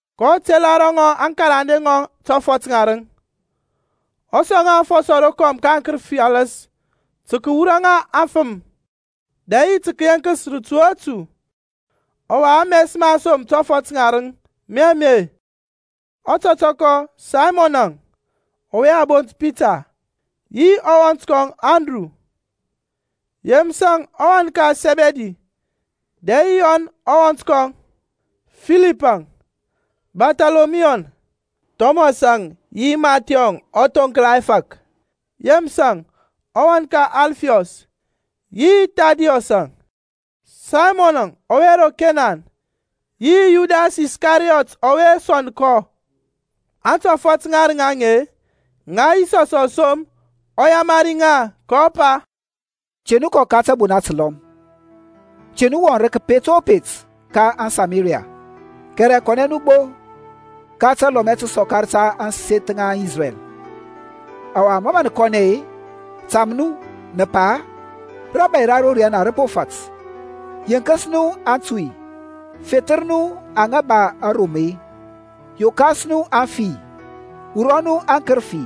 kɔ tela ro ŋɔŋ aŋkarande ŋɔŋ tɔfɔt ŋarǝŋ, ɔ sɔŋ ŋa afɔsɔ rokɔm ka aŋkǝrǝfi alǝs tǝ kǝwura ŋa ka afǝm, dɛ yi tǝ kǝyeŋkǝs rǝtu o rǝtu. Ɔwa ames ma aŋsom tɔfɔt ŋarǝŋ mi ame; Ɔtɔtɔkɔ, Saymɔnȧŋ, ɔwe a bont Pita, yi ɔwɔnt kɔŋ Andru. Yemǝsȧŋ ɔwan ka Sɛbidi, dɛ yi Yɔn ɔwɔnt kɔŋ. Filipȧŋ, Barthɔlɔmiyuȧŋ, Thɔmɔsȧŋ yi Mathyɔŋ, ɔthonkla ɛfȧk. Yemǝsȧŋ, ɔwan ka Alfiɔs, yi Thȧdiyɔsȧŋ. Saymɔnȧŋ ɔwe ro Kenan, yi Yudas Iskariyɔt ɔwe sɔnd kɔ. Antɔfɔt ŋarǝŋ aŋe-e, ŋa Yisɔs ɔ som, ɔ yamari ŋa, kɔ pa, Te nu kɔ ka tȧbona tǝlɔm, te nu wɔŋ rǝ kǝpet o kǝpet ka aŋSamariya, kɛrɛ kɔnɛ nu gbo ka talɔmɛ tǝsɔkar ta ȧŋseth ŋa aŋIsrɛl. Ɔwa ma nǝ kɔnɛ-e, tam nu, nǝ pa, Rȧbȧy ra ro riyana rǝ po fat. Yenkǝs nu aŋtuy, fethǝr nu aŋa ba arom-e, yokas nu aŋfi-e, wurɔ nu aŋkǝrǝfi.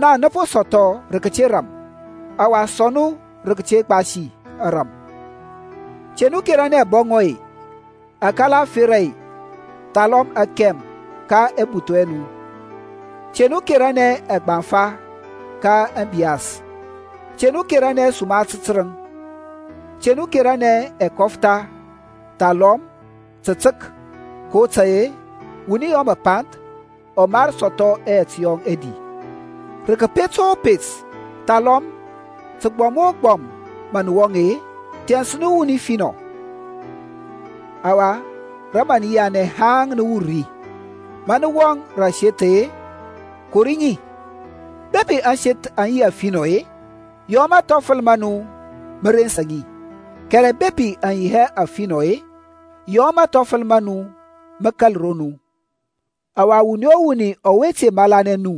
Naŋ nǝ po sɔthɔ rǝ kǝte ram, ɔwa sɔŋ nu rǝ kǝte gbasi ȧrȧm. Te nu keranɛ abɔŋɔ, akala ȧferȧ, thalɔm akɛm ka ɛbuthu ɛ nu. Te nu keranɛ ɛgbaŋfa ka ȧŋbiyas, te nu keranɛ suma tǝrǝŋ, te nu keranɛ ɛkɔftha thalɔm tǝtǝk, kotȧy-e wuni yɔ mǝpanth ɔ mar sɔthɔ ɛyɛt yɔŋ ɛdi. Rǝ kǝpet o kǝpet thalɔm tǝgbɔm o tǝgbɔm mȧ nǝ wɔŋ-e, thɛns ri nu wuni finɔ; ɔwa rǝ mǝ nǝ yianɛ haŋ nǝ wur ri. Ma nǝ wɔŋ rǝ aseth-e, kori ŋi. Bepi ȧŋseth aŋ yi afinɔ-e, yɔ mathɔfǝl ma nu mǝ rensa ŋi, kɛrɛ bepi aŋ yi hɛ afinɔ-e, yɔ mathɔfǝl ma nu mǝ kȧl ro nu. Ɔwa wuni o wuni ɔwe te malanɛ nu,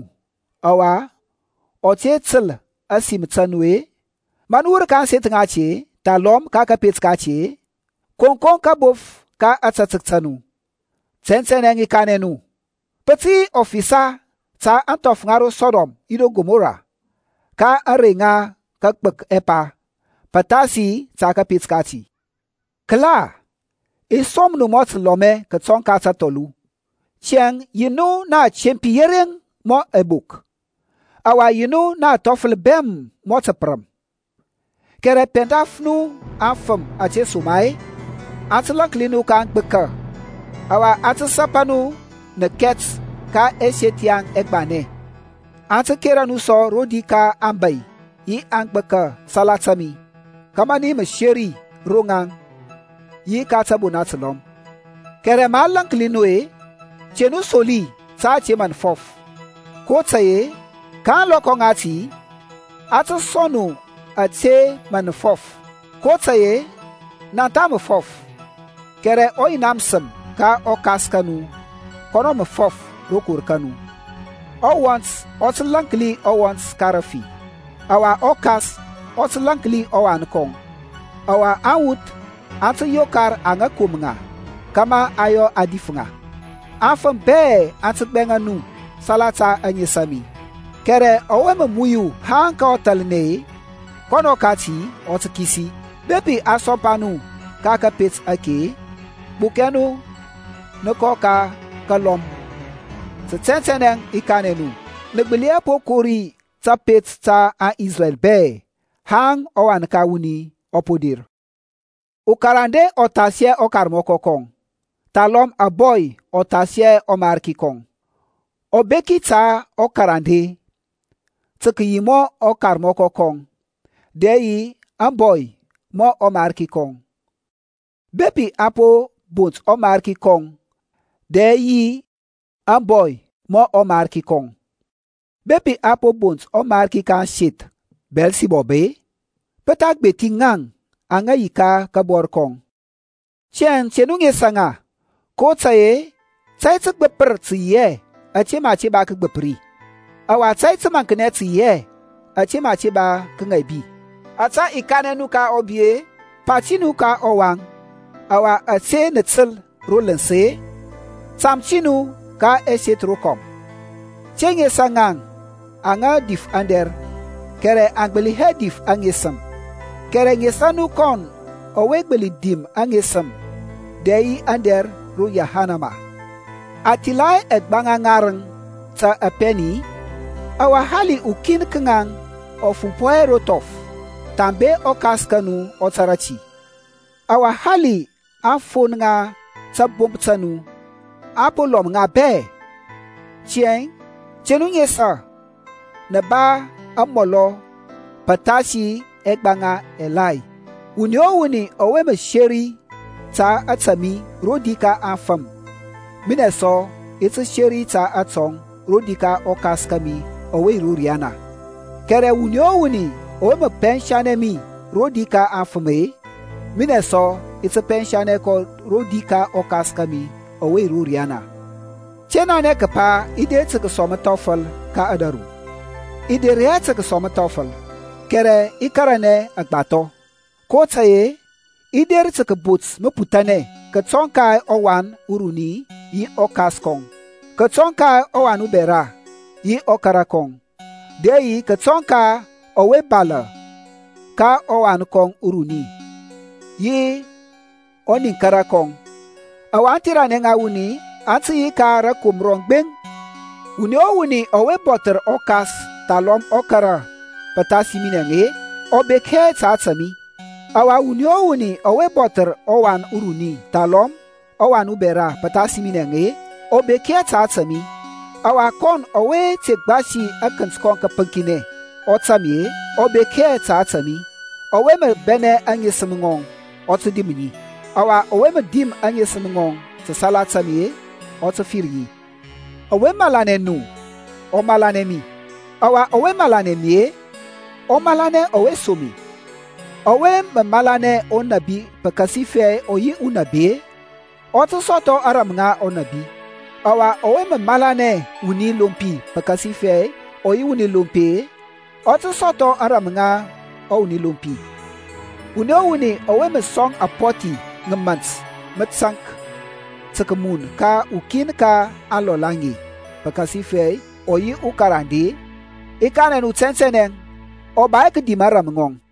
ɔwa ɔ te tǝl ȧsim ta nu-e, ma nǝ wur ka ȧŋseth ŋati-e, thalɔm ka kȧpet kati-e, koŋkoŋ kabof ka ȧtȧtək ta nu. Tɛntɛnɛ i kanɛ nu, pǝ tǝ yi ɔfisa ta ȧŋthɔf ŋa ro Sɔdɔm yi ro Kɔmɔra ka ȧŋrey ŋa kagbǝk ɛpa, pǝthasi ta kȧpet kati. Kǝla, i som nu mɔ tǝlɔmɛ kǝtɔŋ ka tȧthɔlu. Tiyȧŋ, yi nu na atempi yereŋ mɔ ɛbok, ɔwa yi nu na athɔfǝl bɛm mɔ tǝpǝrǝm. Kɛrɛ pɛndaf nu afǝm, ȧtesoma-e aŋ tǝ lȧnki nu ka aŋgbǝka, ɔwa aŋ tǝ sapa nu nǝkɛt ka ɛseth yaŋ ɛgbanɛ. Aŋ tǝ kera nu sɔ rodi ka aŋbȧy yi aŋbȧki salata mi, kȧmȧ nǝ yi mǝseri ro ŋaŋ yi ka tȧbona tǝlɔm. Kɛrɛ ma a lȧnki nu-e, te nu soli ta ȧte mǝ nǝ fɔf, kotȧy-e ka ȧŋlɔkɔ ŋati a tǝ sɔŋ nu ȧte mǝ nǝ fɔf. kotȧy-e naŋ tha mǝ fɔf, kɛrɛ ɔYina mǝsǝm ka ɔKas ka nu kɔnɔ mǝ fɔf rokor ka nu. Ɔwɔnt ɔ tǝ lȧnki ɔwɔnt ka rǝfi, ɔwa ɔkas ɔ tǝ lȧnki ɔwan kɔŋ. Ɔwa awuth aŋ tǝ yokar aŋa kom ŋa kȧmȧ aŋ yɔ a dif ŋa. Afǝm bɛ aŋ tǝ gbɛŋa nu salata ȧŋes a mi, kɛrɛ ɔwe mǝ muyu haŋ ka ɔthalnɛ-e, kɔnɔ kati ɔ tǝ kisi. Bepi a sompa nu ka kȧpet ake-e, gbukɛ nu nǝ kɔ ka kȧlɔm. Tǝ tɛntɛnɛ i kanɛ nu, nǝ gbǝli hɛ po kori tapet ta aŋIsrɛl bɛ haŋ ɔWan ka wuni ɔ po der. Ukarande ɔ thas hɛ ɔkarmɔkɔ kɔŋ, thalɔm ȧbɔy ɔ thas hɛ ɔmarki kɔŋ. Ɔbeki ta ɔkarande tǝ kǝyi mɔ ɔkarmɔkɔ kɔŋ, dɛ yi ȧŋbɔy mɔ ɔmarki kɔŋ. Bepi a po bont ɔmarki kɔŋ, dɛ yi ȧŋbɔy mɔ ɔmarki kɔŋ. Bepi a po bont ɔmarki ka ȧŋseth Biyɛlsibɔb-e, pǝ tha gbethi ŋaŋ aŋa yi ka kabɔr kɔŋ. Tiyȧŋ te nu nesa ŋa, kotȧy-e tȧy tǝgbǝpǝr tǝ yi hɛ ȧte mǝ a te ba kǝgbǝpǝri; ɔwa tȧy tǝmaŋknɛ tǝ yi hɛ ȧte mǝ a te ba kǝŋaibi. Ȧtȧ i kanɛ nu ka ɔbi-e, pa ti nu ka ɔwaŋ. Ɔwa ȧte nǝ tǝl ro lǝns-e, tam ti nu ka ɛseth rokɔm. Te nesa aŋa mǝ dif aŋdɛr, kɛrɛ aŋ gbǝli hɛ dif aŋesǝm. Kɛrɛ nesa nu kɔn ɔwe gbǝli dim aŋesǝm dɛ yi aŋdɛr ro yahanama. A thila hɛ ɛgbaŋa ŋarǝŋ ta apɛni-i? Ɔwa hali ukin ka ŋaŋ ɔ fumpɔ hɛ ro thɔf thambe ɔKas ka nu ɔ tȧrȧ ti. Ɔwa hali aŋfon ŋa tabomp ta nu-e, a po lɔm ŋa bɛ. Tiyȧŋ te nu nesa, nǝ ba mɔlɔ pǝthasi ɛgbaŋa agbȧthi. Wuni o wuni ɔwe mǝ seri ta ȧta mi rodi ka aŋfǝm, minɛ sɔ i ti seri ta atɔŋ rodi ka ɔKas kȧmi ɔwe yi ro riyana. Kɛrɛ wuni o wuni ɔwe mǝ pɛnsanɛ mi rodi ka aŋfǝm-e, minɛ sɔ i ti pɛnsanɛ kɔ rodi ka ɔKas kȧmi ɔwe yi ro riyana. Te nanɛ kǝpa i der tǝ kǝsɔŋ mǝthɔfǝl ka ȧdȧru. I der hɛ tǝ kǝsɔŋ mǝthɔfǝl, kɛrɛ i karanɛ agbathɔ. kotȧy-e i der tǝ kǝbot mǝputhanɛ kǝtɔŋ ka ɔwan uruni yi ɔkas kɔŋ, kǝtɔŋ ka ɔwan ubɛra yi ɔkara kɔŋ, dɛ yi kǝtɔŋ ka ɔwe balȧ ka ɔwan kɔŋ uruni yi ɔniŋkara kɔŋ. Ɔwa aŋtheranɛ ŋa wuni aŋ tǝ yi ka rȧkomra rɔŋ gbeŋ. Wuni o wuni ɔwe bɔthǝr ɔkas thalɔm ɔkara pǝthasi minɛȧŋ, ɔ bek hɛ ta ȧtȧ mi. Ɔwa wuni o wuni ɔwe bɔthǝr ɔwan uruni thalɔm ɔwan ubɛra pǝthasi minɛȧŋ, ɔ bek hɛ ta ȧtȧ mi. Ɔwa kɔn ɔwe te gbasi akǝnt kɔŋ kǝpǝŋkinɛ, ɔ tȧŋ mi-e, ɔ bek hɛ ta ȧtȧ mi Ɔwe mǝ bɛnɛ aŋesǝm ŋɔŋ ɔ tǝ dim ŋi, ɔwa ɔwe mǝ dim aŋesǝm ŋɔŋ salata mi ɔ tǝ fir ŋi. Ɔwe malanɛ nu ɔ malanɛ mi, ɔwa ɔwe malanɛ mi-e, ɔ malanɛ ɔwe som mi. Ɔwe mǝ malanɛ unabi pǝkasifɛ ɔ yi unabi-e, ɔ tǝ sɔthɔ ȧŋrȧm ŋa unabi, ɔwa ɔwe mǝ malanɛ wuni lompi pǝkasifɛ ɔ yi wuni lompi-e, ɔ tǝ sɔthɔ ȧŋrȧm ŋa wuni lompi. Wuni o wuni ɔwe mǝ sɔŋ apɔthi ŋa mȧnt mǝtaŋk tǝ kǝmun ka ukin ka aŋlɔl aŋe pǝkasifɛ ɔ yi ukarande-e, i kanɛ nu tɛntɛnɛ ɔ ba hɛ kǝdim ȧŋrȧm ŋɔŋ.